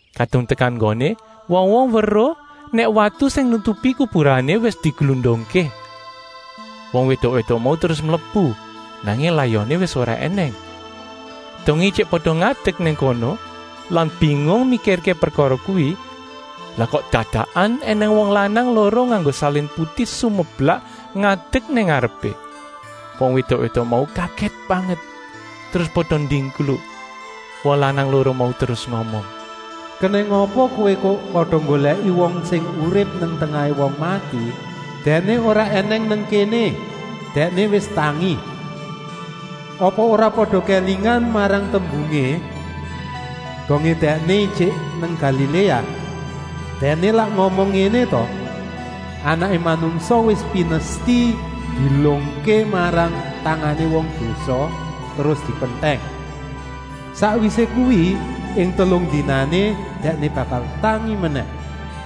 Kadung tekan nggoné, wong-wong weruh nèk watu sing nutupi kuburané wis diglundungké. Wong wédok-wédok mau terus mlebu, nanging layoné wis ora ènèng. Dongé ijik pada ngadek nang kono lan bingung mikirké prekara kuwi, lah kok dadakan ènèng wong lanang loro nganggo salin putih sumeblak ngadek nang ngarepé. Wong wédok-wédok mau kagèt banget terus pada ndingkluk. Wong lanang loro mau terus ngomong: “Kenèng apa kowé kok pada nggolèki wong sing urip nang tengahé wong mati? Dèkné ora ènèng nang kéné, Dèkné wis tangi. Apa ora pada kélingan marang tembungé, dongé Dèkné ijik nang Galiléa. Dèkné lak ngomong ngéné ta: ‘Anaké Manungsa wis pinesti dielungké marang tangané wong dosa terus dipentèng. Sakwisé kuwi, ing telung dinané, Dèkné bakal tangi menèh.’”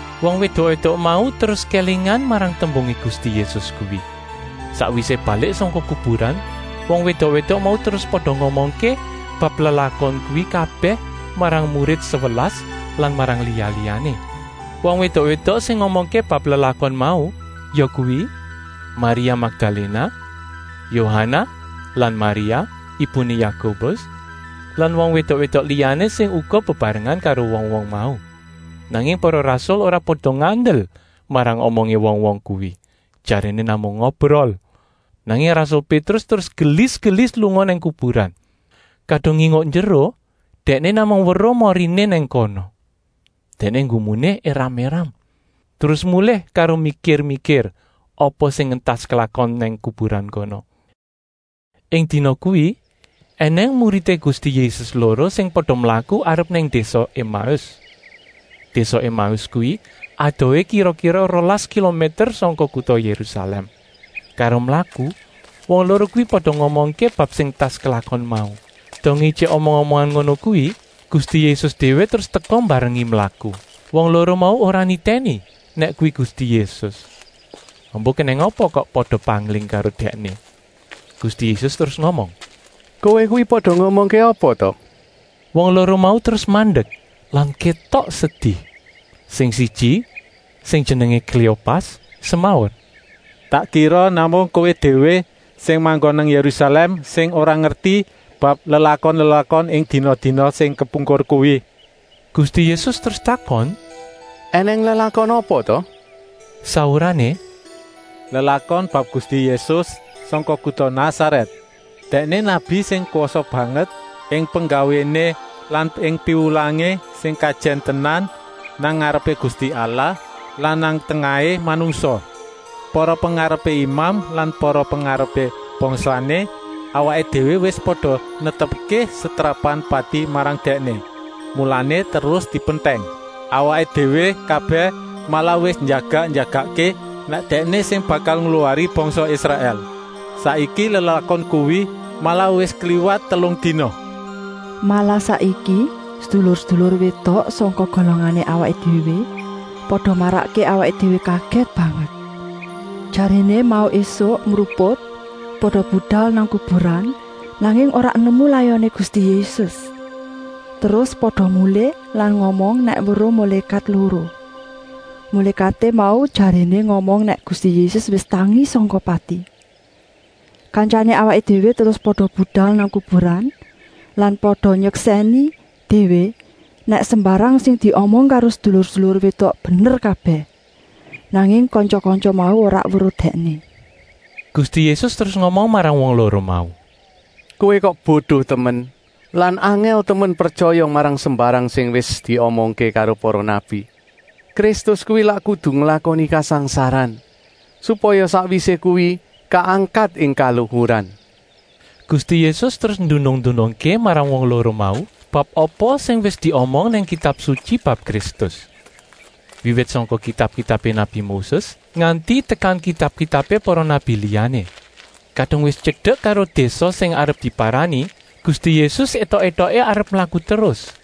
Wong wédok-wédok mau terus kélingan marang tembungé Gusti Yésus kuwi. Sakwisé balik sangka kuburan, wong wédok-wédok mau terus pada ngomongké bab lelakon kuwi kabèh marang murid sewelas lan marang liya-liyané. Wong wédok-wédok sing ngomongké bab lelakon mau yakuwi: Maria Makdaléna, Yohanah lan Maria, ibuné Yakobus lan wong wédok-wédok liyané sing uga bebarengan karo wong-wong mau. Nanging para rasul ora pada ngandel marang omongé wong-wong kuwi, jaréné namung ngobrol. Nanging rasul Pétrus terus gelis-gelis lunga nang kuburan. Kadung nginguk njeruh dèkné namung weruh moriné nang kono. Dèkné nggumuné éram-éram, terus mulih karo mikir-mikir apa sing entas klakon nang kuburan kono. Ing dina kuwi ènèng muridé Gusti Yésus loro sing pada mlaku arep nang désa Emaus. Désa Emaus kuwi adohé kira-kira rolas kilomèter sangka kuta Yérusalèm. Karo mlaku wong loro kuwi pada ngomongké bab sing entas klakon mau. Dongé ijik omong-omongan ngono kuwi Gusti Yésus déwé terus teka mbarengi mlaku. Wong loro mau ora nitèni nèk kuwi Gusti Yésus, embuh kenèng apa kok pada pangling karo Dèkné. Gusti Yésus terus ngomong: “Kowé kuwi pada ngomongké apa ta?” Wong loro mau terus mandek lan kétok sedi. Sing siji, sing jenengé Kléopas, semaur: “Tak kira namung Kowé déwé sing manggon nang Yérusalèm sing ora ngerti bab lelakon-lelakon ing dina-dina sing kepungkur kuwi.” Gusti Yésus terus takon: “Enèng lelakon apa ta?” Saurané: “Lelakon bab Gusti Yésus sangka kuta Nasarèt. Dèkné nabi sing kwasa banget ing penggawéné lan ing piwulangé, sing kajèn tenan nang ngarepé Gusti Allah lan nang tengahé manungsa. Para pengarepé imam lan para pengarepé bangsané awaké déwé wis pada netepké setrapan pati marang Dèkné, mulané terus dipentèng. Awaké déwé kabèh malah wis njagak-njagakké nèk Dèkné sing bakal ngluwari bangsa Israèl. Saiki lelakon kuwi malah wis kliwat telung dina. Malah saiki sedulur-sedulur wédok sangka golongané awaké déwé pada marakké awaké déwé kagèt banget. Jaréné mau ésuk mruput pada budal nang kuburan, nanging ora nemu layoné Gusti Yésus. Terus pada mulih lan ngomong nèk weruh mulékat loro. Mulékaté mau jaréné ngomong nèk Gusti Yésus wis tangi sangka pati. Kantyané awaké déwé terus pada budal nang kuburan lan pada nyeksèni déwé nèk sembarang sing diomong karo sedulur-sedulur wédok bener kabèh. Nanging kantya-kantya mau ora weruh Dèkné.” Gusti Yésus terus ngomong marang wong loro mau: “Kowé kok bodo temen lan angèl temen pretyaya marang sembarang sing wis diomongké karo para nabi. Kristus kuwi lak kudu nglakoni kasangsaran, supaya sakwisé kuwi kaangkat ing kaluhuran.” Gusti Yésus terus ndunung-ndunungké marang wong loro mau bab apa sing wis diomong nang Kitab Sutyi bab Kristus, wiwit sangka kitab-kitabé nabi Moses nganti tekan kitab-kitabé para nabi liyané. Kadung wis tyedek karo désa sing arep diparani, Gusti Yésus étok-étoké arep mlaku terus.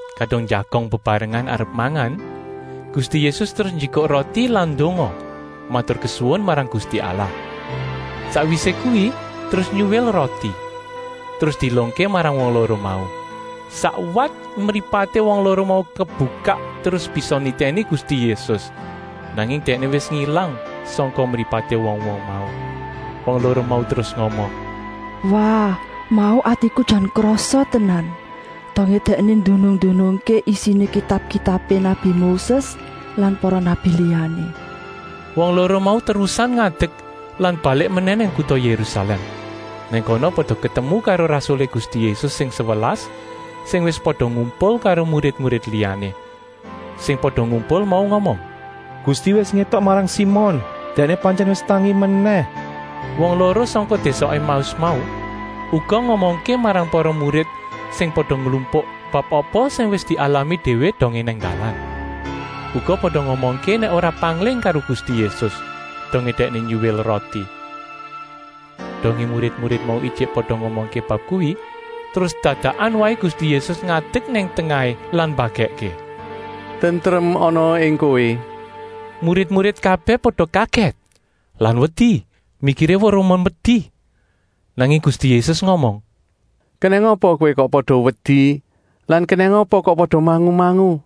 Kadung njagong bebarengan arep mangan, Gusti Yésus terus njikuk roti lan ndonga, maturkesuwun marang Gusti Allah. Sakwisé kuwi terus nyuwil roti, terus dielungké marang wong loro mau. Sakwat mripaté wong loro mau kebukak terus bisa nitèni Gusti Yésus, nanging Dèkné wis ngilang sangka mripaté wong-wong mau. Wong loro mau terus ngomong: “Wah, mau atiku jan krasa tenan, dongé Dèkné ndunung-ndunungké isiné kitab-kitabé nabi Moses lan para nabi liyané.” Wong loro mau terus terusan ngadek lan balik menèh nang kuta Yérusalèm. Nang kono pada ketemu karo rasulé Gusti Yésus sing sewelas, sing wis pada ngumpul karo murid-murid liyané. Sing pada ngumpul mau ngomong: “Gusti wis ngétok marang Simon! Dèkné pantyèn wis tangi menèh!” Wong loro sangka désa Emaus mau uga ngomongké marang para murid sing pada nglumpuk bab apa sing wis dialami déwé dongé nang dalan. Uga pada ngomongké nèk ora pangling karo Gusti Yésus, dongé Dèkné nyuwil roti. Dongé murid-murid mau ijik pada ngomongké bab kuwi terus dadakan waé Gusti Yésus ngadek nang tengahé lan mbagèkké: “Tentrem anaa ing kowé!” Murid-murid kabèh pada kagèt lan wedi, mikiré weruh memedi. Nanging Gusti Yésus ngomong: “Kenèng apa kowé kok pada wedi lan kenèng apa kok pada mangu-mangu?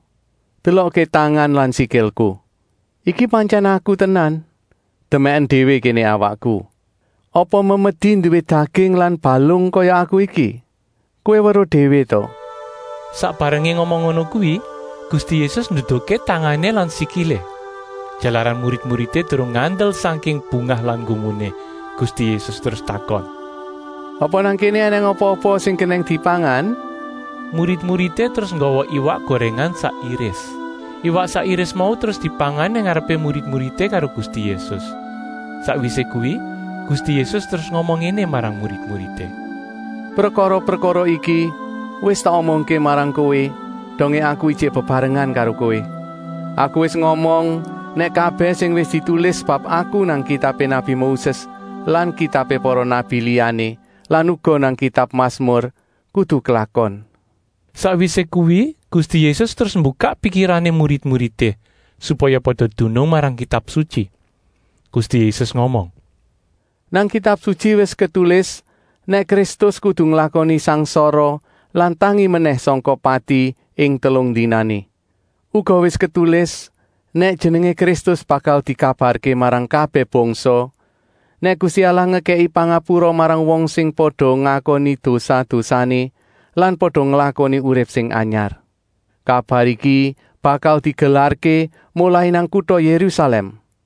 Delokké tangan lan sikilku. Iki pantyèn Aku tenan. Demèken déwé kéné awakku. Apa memedi nduwé daging lan balung kaya Aku iki. Kowé weruh déwé ta?” Sak barengé ngomong ngono kuwi Gusti Yésus nduduhké tangané lan sikilé. Jalaran murid-muridé durung ngandel sangking bungah lan nggumuné, Gusti Yésus terus takon: “Apa nang kéné ènèng apa-apa sing kenèng dipangan?” Murid-muridé terus nggawa iwak gorèngan sak iris. Iwak sak iris mau terus dipangan nang ngarepé murid-muridé karo Gusti Yésus. Sakwisé kuwi Gusti Yésus terus ngomong ngéné marang murid-muridé: “Prekara-prekara iki wis tak omongké marang kowé dongé Aku ijik bebarengan karo kowé. Aku wis ngomong nèk kabèh sing wis ditulis bab Aku nang kitabé nabi Moses lan kitabé para nabi liyané lan uga nang kitab Masmur kudu klakon.” Sakwisé kuwi Gusti Yésus terus mbukak pikirané murid-muridé, supaya pada dunung marang Kitab Sutyi. Gusti Yésus ngomong: “Nang Kitab Sutyi wis ketulis nèk Kristus kudu nglakoni sangsara lan tangi menèh sangka pati ing telung dinané. Uga wis ketulis nèk Jenengé Kristus bakal dikabarké marang kabèh bangsa, nèk Gusti Allah ngekèki pangapura marang wong sing pada ngakoni dosa-dosané lan pada nglakoni urip sing anyar. Kabar iki bakal digelarké molai nang kuta Yérusalèm.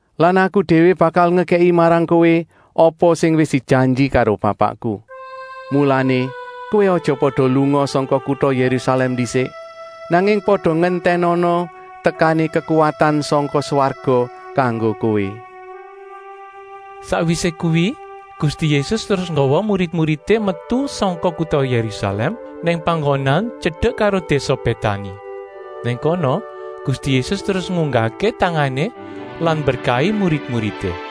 Lan Aku déwé bakal ngekèki marang kowé apa sing wis dijanji karo Bapakku. Mulané kowé aja pada lunga sangka kuta Yérusalèm ndisik, nanging pada ngentènana tekané kekuwatan sangka swarga kanggo kowé.” Sakwisé kuwi Gusti Yésus terus nggawa murid-muridé metu sangka kuta Yérusalèm nang panggonan tyedek karo désa Bétani. Nang kono Gusti Yésus terus ngunggahké tangané lan mberkahi murid-muridé.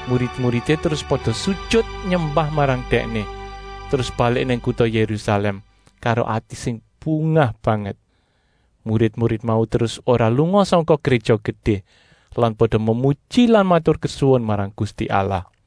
Murid-muridé terus pada sujut nyembah marang Dèkné, terus balik nang kuta Yérusalèm karo ati sing bungah banget. Murid-murid mau terus ora lunga sangka Gréja Gedé lan pada memuji lan maturkesuwun marang Gusti Allah.